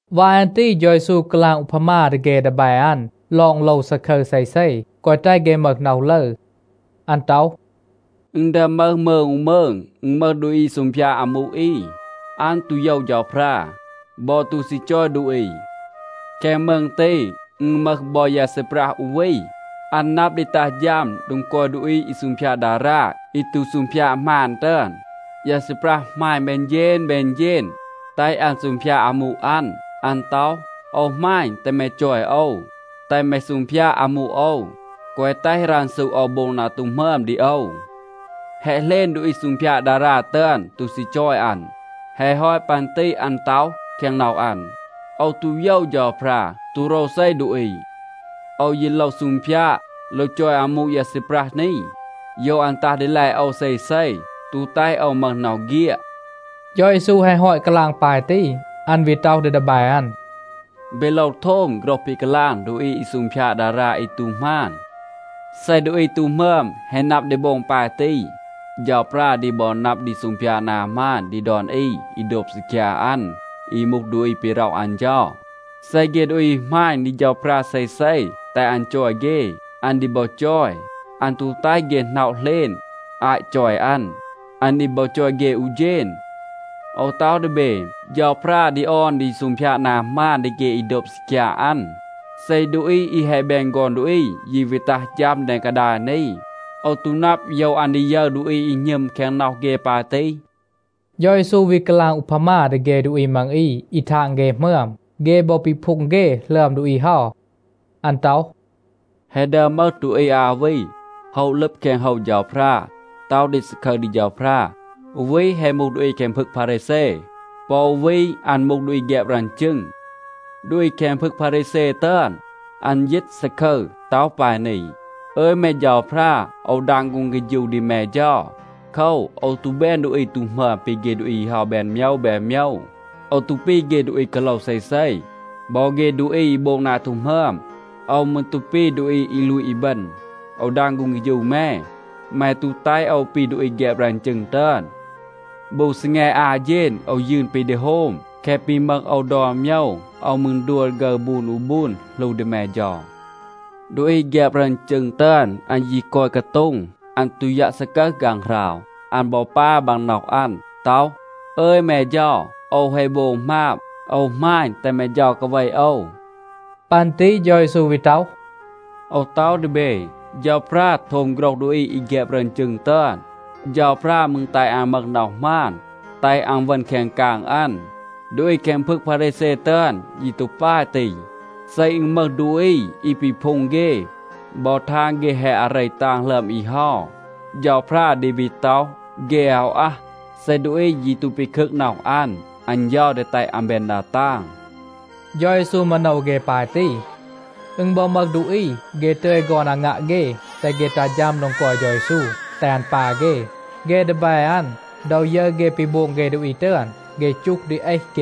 วาย อัน ตี เฌา เยซู กาลาง อูพามา ดี เฆ ดีแบ อัน ลอง โลว ซาคึร เซเซ, แกวะ แตห เฆ มึห น็อห ลึร. อัน ต็อห, “อึณ ดึอม มึห มืง อู มืง. อึณ มึห ดูอี อี ซูงพยาด อามู อี. อัน ตู โยว เฌาพรา, บอ ตู ซี จอย ดูอี. แคง มืง ตี อึณ มึห บอ ยา ซีปรัห อู วี, อัน นับ ดี ตัห ฌัม โดง กอย ดูอี อี ซูงพยาด ดารา อี ตู ซูงพยาด หมาน ตึอน. ยา ซีปรัห หมาณ แบน เฌณ แบน เฌณ, แตห อัน ซูงพยาด อามู อัน. อัน ต็อห, ‘โอว หมาณ, แตห แม จอย โอว, แตห แม ซูงพยาด อามู โอว, แกวะ แตห รันซู โอว โบง นา ตู หมึอม ดี โอว.’ แฮะ เหลณ, ดูอี ซูงพยาด ดารา ตึอน ตู ซี จอย อัน. แฮะ ฮอต ปัน ตี อัน ต็อห แคง น็อห อัน, ‘โอว ตู โยว เฌาพรา, ตู โรวเซ ดูอี, โอว ยี โลว ซูงพยาด, โลว จอย อามู ยา ซีปรัห นี. โยว อัน ตัห ดีแล โอว เซเซ, ตู แตห โอว มึห น็อห เฆียด.’” เฌา เยซู แฮะ ฮอต กาลาง ปาย ตี, อัน วี ต็อห ดี ดีแบ อัน, “เบ โลว โทม โฆรห ปี กาลาง ดูอี อี ซูงพยาด ดารา อี ตู หมาน. เซ ดูอี ตู หมึอม แฮะ นับ ดี โบง ปาย ตี, เฌาพรา ดี บอ นับ ดี ซูงพยาด นา หมาน ดี ดอน อี อี โดบ ซีคยา อัน, อี มูห ดูอี ปี ร็อห อัน เฌา. เซ เฆ ดูอี หมาณ ดี เฌาพรา เซเซ, แตห อัน จอย เฆ, อัน ดี บอ จอย. อัน ตู แตห เฆ หน็อะ เหลณ อาต จอย อัน. อัน ดี บอ จอย เฆ อู เฌณ. โอว ต็อห ดี เบ, เฌาพรา ดี ออน ดี ซูงพยาด นา หมาน ดี เฆ อี โดบ ซีคยา อัน. เซ ดูอี อี แฮะ แบน ฆอน ดูอี ยี วี ตัห ฌัม แดง กาดาย นี, โอว ตู นับ, โยว อัน ดี ยึร ดูอี อี หณึม แคง น็อห เฆ ปาย ตี.” เฌา เยซู วี กาลาง อูพามา ดี เฆ ดูอี มัง อี อี ทาง เฆ หมึอม. เฆ บอ ปีพูง เฆ หลึอม ดูอี เฮา. อัน ต็อห, “แฮะ ดึอม มึห ดูอี อา วี, โฮะ ลึบ แคง โฮว เฌาพรา, ต็อห ดี ซาคึร ดี เฌาพรา. อู วี แฮะ มูห ดูอี แคง พึง พารีแซ. ปอ อู วี, อัน มูห ดูอี แฆบ รึอน จึง. ดูอี แคง พึง พารีแซ ตึอน, อัน ยีต ซาคึร, ต็อห ปาย นี, ‘อึย แม เฌาพรา, โอว ดาง ฆูง เฆฌู ดี แม เฌา. โคว, โอว ตู แบน ดูอี ตู หมึอม ปี เฆ ดูอี เฮา แบน โมยว แบน โมยว. โอว ตู ปี เฆ ดูอี กาโลว เซเซ, บอ เฆ ดูอี อี โบง นา ตู หมึอม. โอว มืร ตู ปี ดูอี อี ลูต อีบึณ. โอว ดาง ฆูง เฆฌู แม, แม ตู แตห โอว ปี ดูอี แฆบ รึอน จึง ตึอน. บู ซีแง อา เฌณ โอว ยืน ปี ดี โฮม. แคะ ปี มึห โอว ดอน โมยว, โอว มืร ดัว ฆึร บูน อู บูน, หลู ดี แม เฌา.’ ดูอี แฆบ รึอน จึง ตึอน, อัน ยี กอย กาโต็ง. อัน ตู ยัะ ซากึห ฆางหราว. อัน บอ ปา บางน็อห อัน. ต็อห, ‘อึย แม เฌา, โอว แฮะ โบง หมาบ. โอว หมาณ, แตห แม เฌา กาเว โอว.’” ปัน ตี เฌา เยซู วี ต็อห, “โอว ต็อห ดี เบ. เฌาพรา โทม โฆรห ดูอี อี แฆบ รึอน จึง ตึอน. เฌาพรา มืร แตห อัน มึห น็อห หมาน, แตห อัน เวณ แคง กาง อัน. ดูอี แคง พึง พารีแซ ตึอน ยี ตู ปาย ตี. เซ อึณ มึห ดูอี อี ปีพูง เฆ, บอ ทาง เฆ แฮะ อาเร ตาง หลึอม อี เฮา, เฌาพรา ดี วี ต็อห, เฆ อาว อัห. เซ ดูอี ยี ตู ปีคึก น็อห อัน, อัน เฌา ดี แตห อัน แบน ดา ตาง.” เฌา เยซู มาโนว เฆ ปาย ตี. อึณ บอ มึห ดูอี, เฆ ตึย ฆอน อางัะ เฆ, แตห เฆ ตัห ฌัม โดง กอย เฌา เยซู, แตห อัน ปา เฆ. เฆ ดีแบ อัน, ดอ ยึร เฆ ปี โบง เฆ ดูอี ตึอน, เฆ จูห ดี เอห เฆ.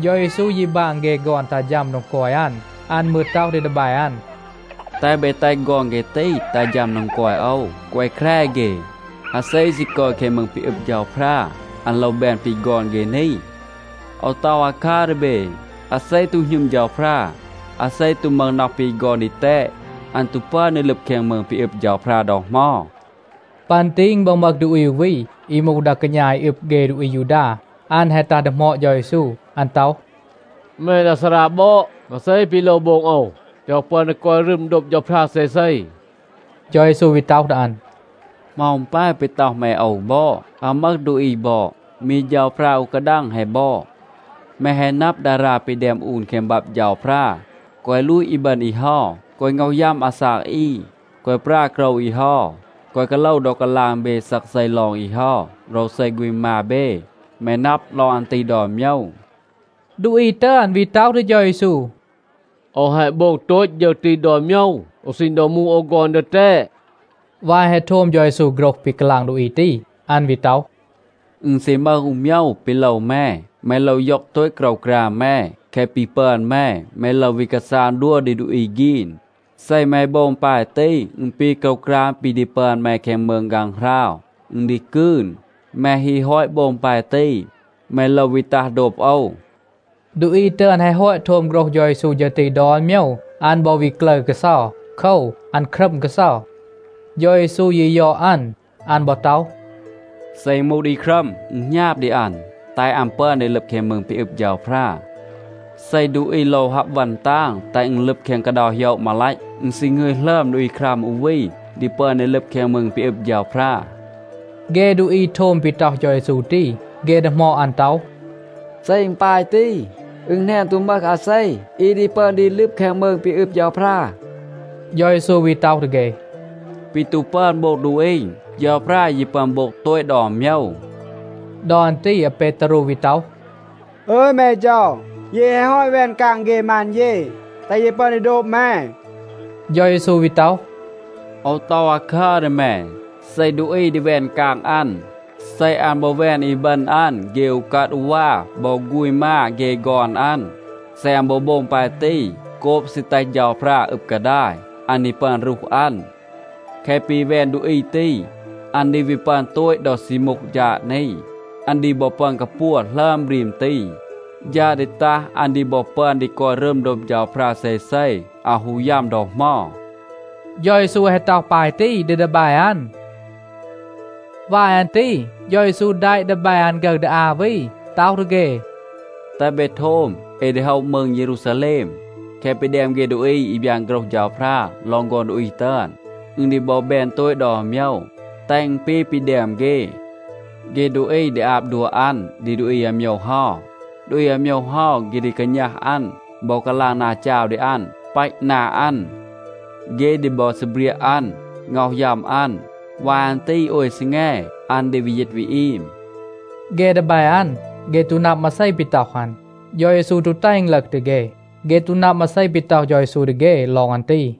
เฌา เยซู ยี บาง เฆ ฆอน ตัห ฌัม โดง กอย อัน. อัน มืร ต็อห ดี ดีแบ อัน, “แตห เบ แตห ฆอน เฆ ตี ตัห ฌัม โดง กอย โอว. แกวะ แคร เฆ. อาเซ ซี กอย แคง มืง ปี อึบ เฌาพรา, อัน โลว แบน ปี ฆอน เฆ นี. โอว ต็อห อาคัร ดี เบ, อาเซ ตู หณึม เฌาพรา, อาเซ ตู มึห น็อห ปี ฆอน ดีแตด, อัน ตู ปึอน ดี ลึบ แคง มืง ปี อึบ เฌาพรา ดอ เหมา.” ปัน ตี อึณ บอ มึห ดูอี อู วี, อี มูห ดา กาณา อี อึบ เฆ ดูอี อายูดา. อัน แฮะ ตัห ดีหมอด เฌา เยซู. อัน ต็อห, “แม ดา ซารา บอด, มาเซ ปี โลว โบง โอว, แตห โอว ปึอน ดี กอย รึม โดบ เฌาพรา เซเซ?” เฌา เยซู วี ต็อห ดี อัน, “เหมา อึณ ปาย ปี ต็อห แม โอว บอด? อาว มึห ดูอี บอด. มี เฌาพรา อู กาดัง แฮะ บอด. แม แฮะ นับ, ดารา ปี แดม อูน แคง บับ เฌาพรา, ‘แกวะ ลูต อีบึณ อี เฮา. แกวะ ง็อห ยัม อาซาก อี. แกวะ ปรา โกรว อี เฮา. แกวะ กาโลว ดอ กาลาง เบ ซักเซ ลอง อี เฮา, โรวเซ ฆูณ มา เบ.’ แม นับ ลอง อัน ตี ดอน โมยว.” ดูอี ตึอน วี ต็อห ดี เฌา เยซู, “โอว แฮะ โบง โตต ฌึร ตี ดอน โมยว อู ซีณ ดอ มูห โอว ฆอน ดีแตด.” วาย แฮะ โทม เฌา เยซู โฆรห ปี กาลาง ดูอี ตี, อัน วี ต็อห, “อึณ ซี มึห อู โมยว ปี โลว แม. แม โลว ย็อง โตต โกรวกราม แม. แคะ ปี ปึอน แม, แม โลว วี กาซาง ดัว ดี ดูอี ฆีน. เซ แม โบง ปาย ตี, อึณ ปี โกรวกราม ปี ดี ปึอน แม แคง มืง ฆางหราว, อึณ ดี กืน. แม ฮี ฮอต โบง ปาย ตี, แม โลว วี ตัห โดบ โอว.” ดูอี ตึอน แฮะ ฮอต โทม โฆรห เฌา เยซู ฌึร ตี ดอน โมยว, อัน บอ วี กลึร กาเซา. โคว, อัน ครัม กาเซา. เฌา เยซู ยี ยอด อัน. อัน บอ ต็อห, “เซ อึณ มูห ดูอี ครัม, อึณ หณาบ ดี อัน, แตห อัน ปึอน ดี ลึบ แคง มืง ปี อึบ เฌาพรา. เซ ดูอี โลว ฮับ วัน ตาง,a แตห อึณ ลึบ แคง กาเดา โหยะ มาลัต, อึณ ซี หงึย หลึอม ดูอี ครัม อู วี ดี ปึอน ดี ลึบ แคง มืง ปี อึบ เฌาพรา.” เฆ ดูอี โทม ปี ต็อห เฌา เยซู ตี, เฆ ดีหมอด อัน ต็อห, “เซ อึณ ปาย ตี, อึณ แหนน ตู มึห อาเซ อี ดี ปึอน ดี ลึบ แคง มืง ปี อึบ เฌาพรา.” เฌา เยซู วี ต็อห ดี เฆ, “ปี ตู ปึอน โบง ดูอี, เฌาพรา ยี ปึอน โบง โตต ดอน โมยว.” ดอ อัน ตี อาเปตารู วี ต็อห, “อึย แม เฌา, เย แฮะ ฮอต แวน กาง เฆ มาน เย, แตห เย ปึอน ดี โดบ แม.” เฌา เยซู วี ต็อห, “โอว ต็อห อาคาคัร ดี แม, เซ ดูอี ดี แวน กาง อัน, เซ อัน บอ แวน อีบึณ อัน เฆ อูกัด อูวา บอ ฆูณ มา เฆ ฆอน อัน, เซ อัน บอ โบง ปาย ตี โกบ ซี แตห เฌาพรา อึบ กาดาย, อัน ดี ปึอน รูห อัน. แคะ ปี แวน ดูอี ตี, อัน ดี วี ปึอน โตต ดอ ซี มูห ฌาด นี. อัน ดี บอ ปึอน กาปัว หลึอม บรีม ตี. ฌาด ดี ตัห, อัน ดี บอ ปึอน ดี กอย รึม โดบ เฌาพรา เซเซ, อาว ฮู ยัม ดอ เหมา.” เฌา เยซู แฮะ ต็อห ปาย ตี ดี ดีแบ อัน. วาย อัน ตี เฌา เยซู แดะ ดีแบ อัน ฆึร ดี อา วี, ต็อห ดี เฆ, “แตห เบ โทม. เอ ดี โฮะ มืง เยรูซาแลม. แคะ ปี แดม เฆ ดูอี อี บยาน โฆรห เฌาพรา ลอง ฆอน ดูอี ตึอน, อึณ ดี บอ แบน โตต ดอน โมยว, แตห อึณ ปี ปี แดม เฆ. เฆ ดูอี ดี อาบ ดัว อัน ดี ดูอี อาโมยว เฮา. ดูอี อาโมยว เฮา, เฆ ดี กาณัห อัน บอ กาลาง นา จาว ดี อัน, ปัต นา อัน. เฆ ดี บอ ซีเบรียะ อัน, ง็อห ยัม อัน. วาย อัน ตี โอย ซีแง, อัน ดี วี ยีต วี อีม.” เฆ ดีแบ อัน, เฆ ตู นับ มาเซ ปี ต็อห อัน. เฌา เยซู ตู แตห อึณ ลึห ดี เฆ. เฆ ตู นับ มาเซ ปี ต็อห เฌา เยซู ดี เฆ ลอง อัน ตี.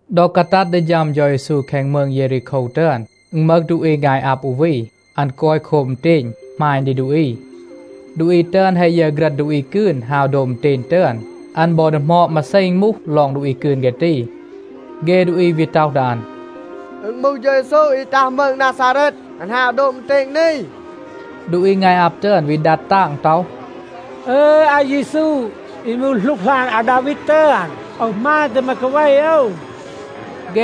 ดอ กาตัด ดี ฌัม เฌา เยซู แคง มืง เยรีโคว ตึอน, อึณ มึห ดูอี งาย อับ อู วี. อัน กอย โคบ อึณเตณ, หมาณ ดี ดูอี. ดูอี ตึอน แฮะ ยึร ฆรัณ ดูอี กืน ฮาว โดบ อึณเตณ ตึอน, อัน บอ ดีหมอด มาเซ อึณ มูห ลอง ดูอี กืน เฆ ตี. เฆ ดูอี วี ต็อห ดี อัน, “อึณ มูห เฌา เยซู อี ตัห มืง นาซาเรต, อัน ฮาว โดบ อึณเตณ นี.” ดูอี งาย อับ ตึอน วี ดัด ตาง ต็อห, “อึย, อาเยซู, อี มูห หลูกหลาน อาดาวีด ตึอน, โอว หมาณ แตห แม กาเว โอว.”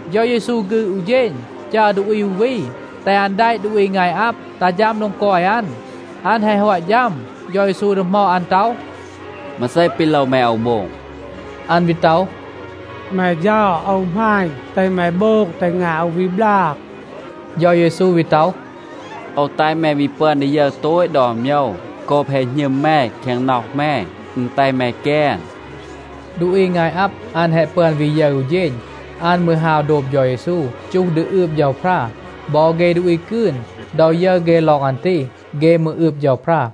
เฌา เยซู ฆืด อู เฌณ, จัร ดูอี อู วี, แตห อัน แดะ ดูอี งาย อับ ตัห ฌัม โดง กอย อัน. อัน แฮะ ฮอต ฌัม, เฌา เยซู ดีหมอด อัน ต็อห, “มาเซ ปี โลว แม โอว โบง?” อัน วี ต็อห, “แม เฌา, โอว หมาณ, แตห แม โบง แตห งาย โอว วี บลาง.” เฌา เยซู วี ต็อห, “โอว แตห แม วี ปึอน ดี ยึร โตต ดอน โมยว. โกบ แฮะ หณึม แม แคง น็อห แม, อึณ แตห แม แกน.” ดูอี งาย อับ, อัน แฮะ ปึอน วี ยึร อู เฌณ. อัน มืร ฮาว โดบ เฌา เยซู, จูห ดี อืบ เฌาพรา. บอ เฆ ดูอี กืน, ดอ ยึร เฆ ลอง อัน ตี, เฆ มืร อืบ เฌาพรา.